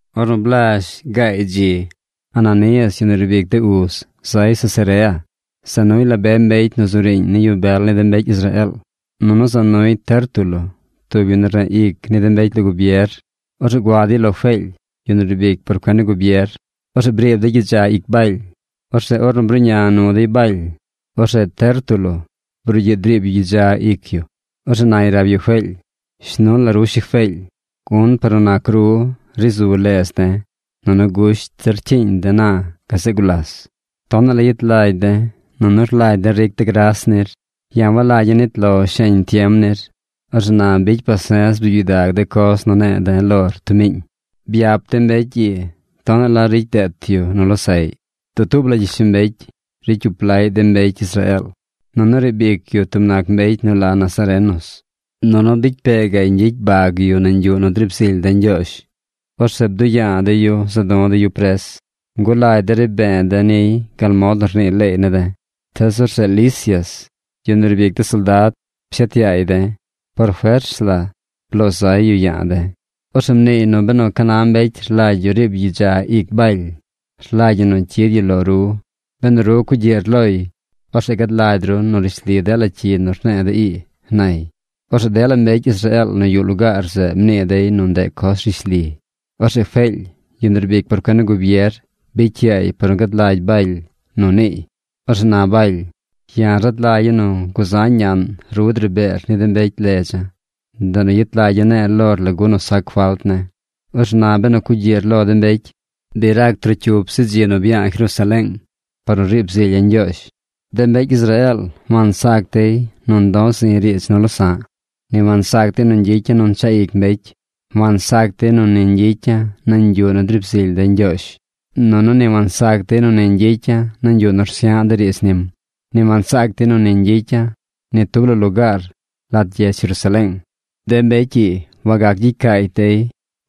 Ornu blazh gaay dzi, Ananías, yu nu riib ic de uz zay Cesarea. Za nuy la be mbecy nu zu riiñ ni yu bel ni de mbecy Israeel. Nunu za nuy Tértulo, tub yu nu rneꞌ ic ni de mbecy lo gubier. Orzeꞌ gua dey lo Feely, yu nu riib ic por cuen ni gubier. Orzeꞌ briib dey gyidza ic Baly. Orzeꞌ ornu bruꞌña nu dey Baly, orzeꞌ Tértulo brugyiꞌ driib yu gyidza ic yu. Orzeꞌ nay rab yu Feely: ―Shnu la ru Shi Feely, gun par nu nac ru, ri zu ledz de̱. Nunu gusht zir rcyiiñ de̱ na gazeꞌ gulas. Tonaꞌ la yet lagy de̱, nunu rlagy de̱ ric de̱ gras nir. Ya̱ walagya̱ nit lo sheñ tiem nir. Orzeꞌ na bicy pase̱z bzuub gyidag de coz nu ne̱e̱ de̱ lor tub miiñ. Byap de̱ mbecy ii tonaꞌ la ricy deet yu nu losaꞌy. Dutuub la gyishlombecy ricy cyup laꞌy de mbecy Israeel, nunu riib ic yu tub nac mbecy nu la nazarenos. Nunu bicy pee gaꞌy ñgyicy bag yu nañ yuꞌ nu driib zily de̱ Ñgyoozh. Orzeꞌ bduꞌ ya̱a̱ de̱ yu za̱ du̱ de̱ yu pres. Ngulagy de̱ ri be̱e̱ de̱ niy gal mod nu rnii leey ne̱ de̱. Tees orzeꞌ Lisias, yu nu riib ic de soldad, pshet yaay de̱. Por fers la bloo zay yu ya̱a̱ de̱. Orzeꞌ mniiy nu benu ca na mbecy rlagy yu riib yu gyidza ic Baly, rlagy ñi nu cyid yu lo ru. Benu ru cugyiꞌr loy, orzeꞌ gad lagy ru nu rishli dela cyi nu rne̱e̱ de̱ ii ―nay. Orzeꞌ dela mbecy Israeel nu yuꞌ lugaar zeꞌ mnii dey nu ndeꞌ coz rishli. Orzeꞌ Feely, yu nu riib ic por cuen ni gubier, bicy yaay par nu gad lagy Baly nu niiy. Orzeꞌ na Baly: ―Ya̱ rad lagya̱ nu guzañ ñaꞌn ru dri beer ni de mbecy ledza̱. Ndeꞌ nu yet lagya̱ ne̱e̱ lor lagu nu sac falt ne̱. Orzeꞌ na benu cugyiꞌr lo de mbecy, bi rac trocyup zi dzi nu bya̱a̱ Jerusaleeng par nu riib zilya̱ Ñgyoozh. De mbecy Israeel wansac dey nu ndoo zi̱ riidz nu losa̱ꞌ. Ni wansac dey nu ñgyicya̱ nu nchaꞌ ic mbecy. Wansac dey nu ni ñgyicya̱ nañ yuꞌ nu driib zily de̱ Ñgyoozh. Nunu ni wansac dey nu ni ñgyicya̱ nañ yuꞌ nu rsya̱ꞌ de̱ riidz nim. Ni wansac dey nu ni ñgyicya̱ ni tub la lugaar lat gyedz Jerusaleeng. De mbecy ii wagac gyicy caacy dey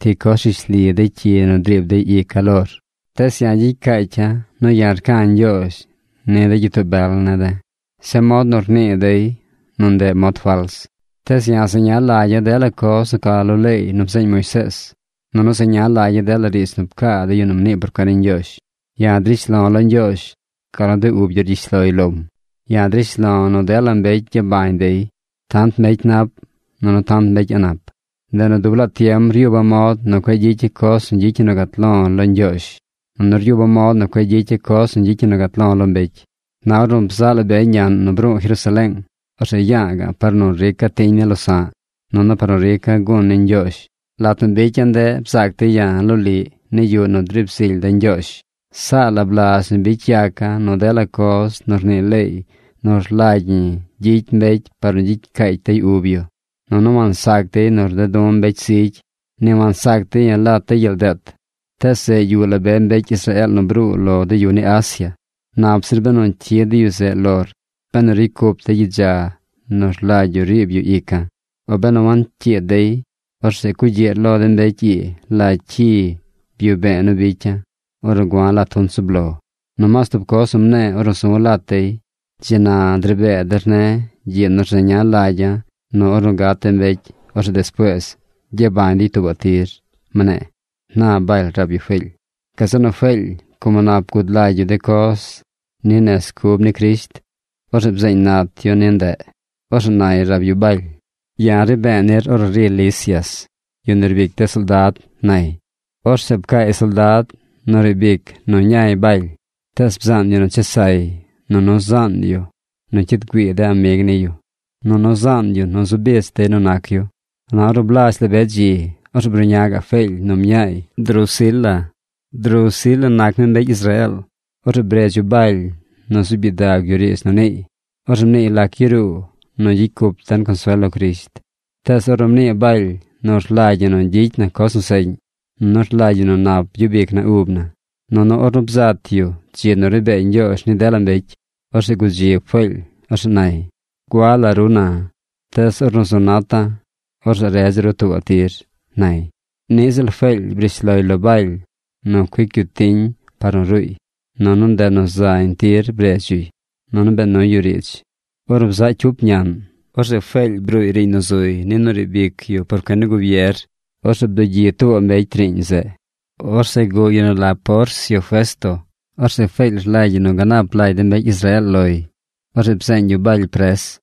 ti coz rishli de cyi nu driib dey ica̱ lor. Tees ya̱ gyicy caacya̱ nu ya̱ rca̱ Ñgyoozh ni de gyitoo bel ne̱ de̱ zeꞌ mod nu rnii dey nu ndeꞌ mod fals. Tees ya̱ zeña lagya̱ dela coz nu ca lo leey nu bzeeñ Moisees. Nunu zeña lagya̱ dela riidz nu pcaa de yu nu mnii por cuen ni Ñgyoozh. Ya̱ drish lo̱ lo Ñgyoozh gal nu de ub yu niꞌ rgyish loy lom. Ya̱ drish lo̱ nu dela mbecy gyabañ dey: tant mbecy nap, nunu tant mbecy a̱ꞌ nap. Ndeꞌ nu dub laa tiem ryuba̱ mod nu cueꞌ gyicya̱ coz nu gyicy ñi nu gat lo̱ lo Ñgyoozh. Nunu ryuba̱ mod nu cueꞌ gyicya̱ coz nu gyicy ñi nu gat lo̱ lo mbecy. ’Na ornu bzaꞌ la be ñaꞌn nu bru̱u̱ Jerusaleeng, orzeꞌ ya̱a̱ ga̱ꞌ par nu rica̱ tiñ ni losa̱ꞌ, nunu par nu rica̱ gun ni Ñgyoozh. Lat nu bicya̱ ndeꞌ bzaac dey ya̱ loliꞌ ni yuꞌ nu driib zily de̱ Ñgyoozh. Saa la blazh nu bicy yaca̱ nu dela coz nu rnii leey nu rlagy ñi gyicy mbecy par nu gyicy caacy dey ub yu. Nunu wansac dey nu rded du̱ mbecy zigy. Ni wansac dey ya̱ lat de gyel deet. Tees zeꞌ yuꞌ la be mbecy Israeel nu bruu lo de yu ni Asia. Nap zir benu cyid de yu zeꞌ lor benu ricy cup dey gyidza nu rlagy yu riib yu ica̱. O benu wancyiid dey, orzeꞌ cugyiꞌr lo de mbecy ii la cyi byuꞌ be̱e̱ nu bicya̱ ornu gua̱ lat junt zub lo. Nomaas tub coz mne̱e̱ ornu zu̱ lat dey: “Dzi na dri bee der ne̱ gyiꞌ nu rzeña lagya̱ nu ornu gat de mbecy, orzeꞌ despuees gyabañ dey tuubaꞌ tir”, mne̱e̱ ―na Baly rab yu Feely. Gazeꞌ nu Feely como nap gud lagy yu de coz ni nez cub ni Crisht, orzeꞌ bzeeñ naat yu ni ndeꞌ. Orzeꞌ nay rab yu Baly: ―Ya̱ ri be̱e̱ nir ornu ri Lisias, yu nu riib ic de soldad ―nay. Orzeꞌ pcaay soldad nu riib ic nu ñay Baly. Tees bzaan yu nu chesay, nunu zaan yu nu cyid güii de amig niy yu, nunu zaan yu nu zu bich dey nu nac yu. Na ornu blazh la be dzi, orzeꞌ bruꞌña gaꞌ Feely nu mñaay Drusila. Drusila nac mi mbecy Israeel. Orzeꞌ bredz yu Baly nu zuub gyidag yu riidz nu niiy. Orzeꞌ mniiy lac yaruu nu gyicy cup den consuel lo Crisht. Tees ornu mnii Baly nu rlagy ñi nu gyicy na coz nu seꞌñ, nunu rlagy ñi nu nap gyub ic na ub na, nunu ornu bzat yu dzi nu ri bee Ñgyoozh ni dela mbecy, orzeꞌ gudzib Feely. Orzeꞌ nay: ―Gua la ru na, tees ornu zu nata̱, orzeꞌ redza̱ ru tuubaꞌ tir ―nay. Niꞌ ziꞌl Feely brish loy lo Baly nu cuic yu tiñ par nu ruuy. Nunu ndeꞌ nu zañ tir bredz yuy. Nunu bee nuy yu riidz. Ornu bzaꞌ cyup ñaꞌn, orzeꞌ Feely bruuy riiñ nu zuy ni nu riib ic yu por cuen ni gubier. Orzeꞌ bdugyi tuubaꞌ mbecy riiñ zeꞌ. Orzeꞌ guꞌ yu nu la Porcio Festo. Orzeꞌ Feely rlagy yu nu ganap lagy de mbecy Israeel loy. Orzeꞌ bzeeñ yu Baly pres.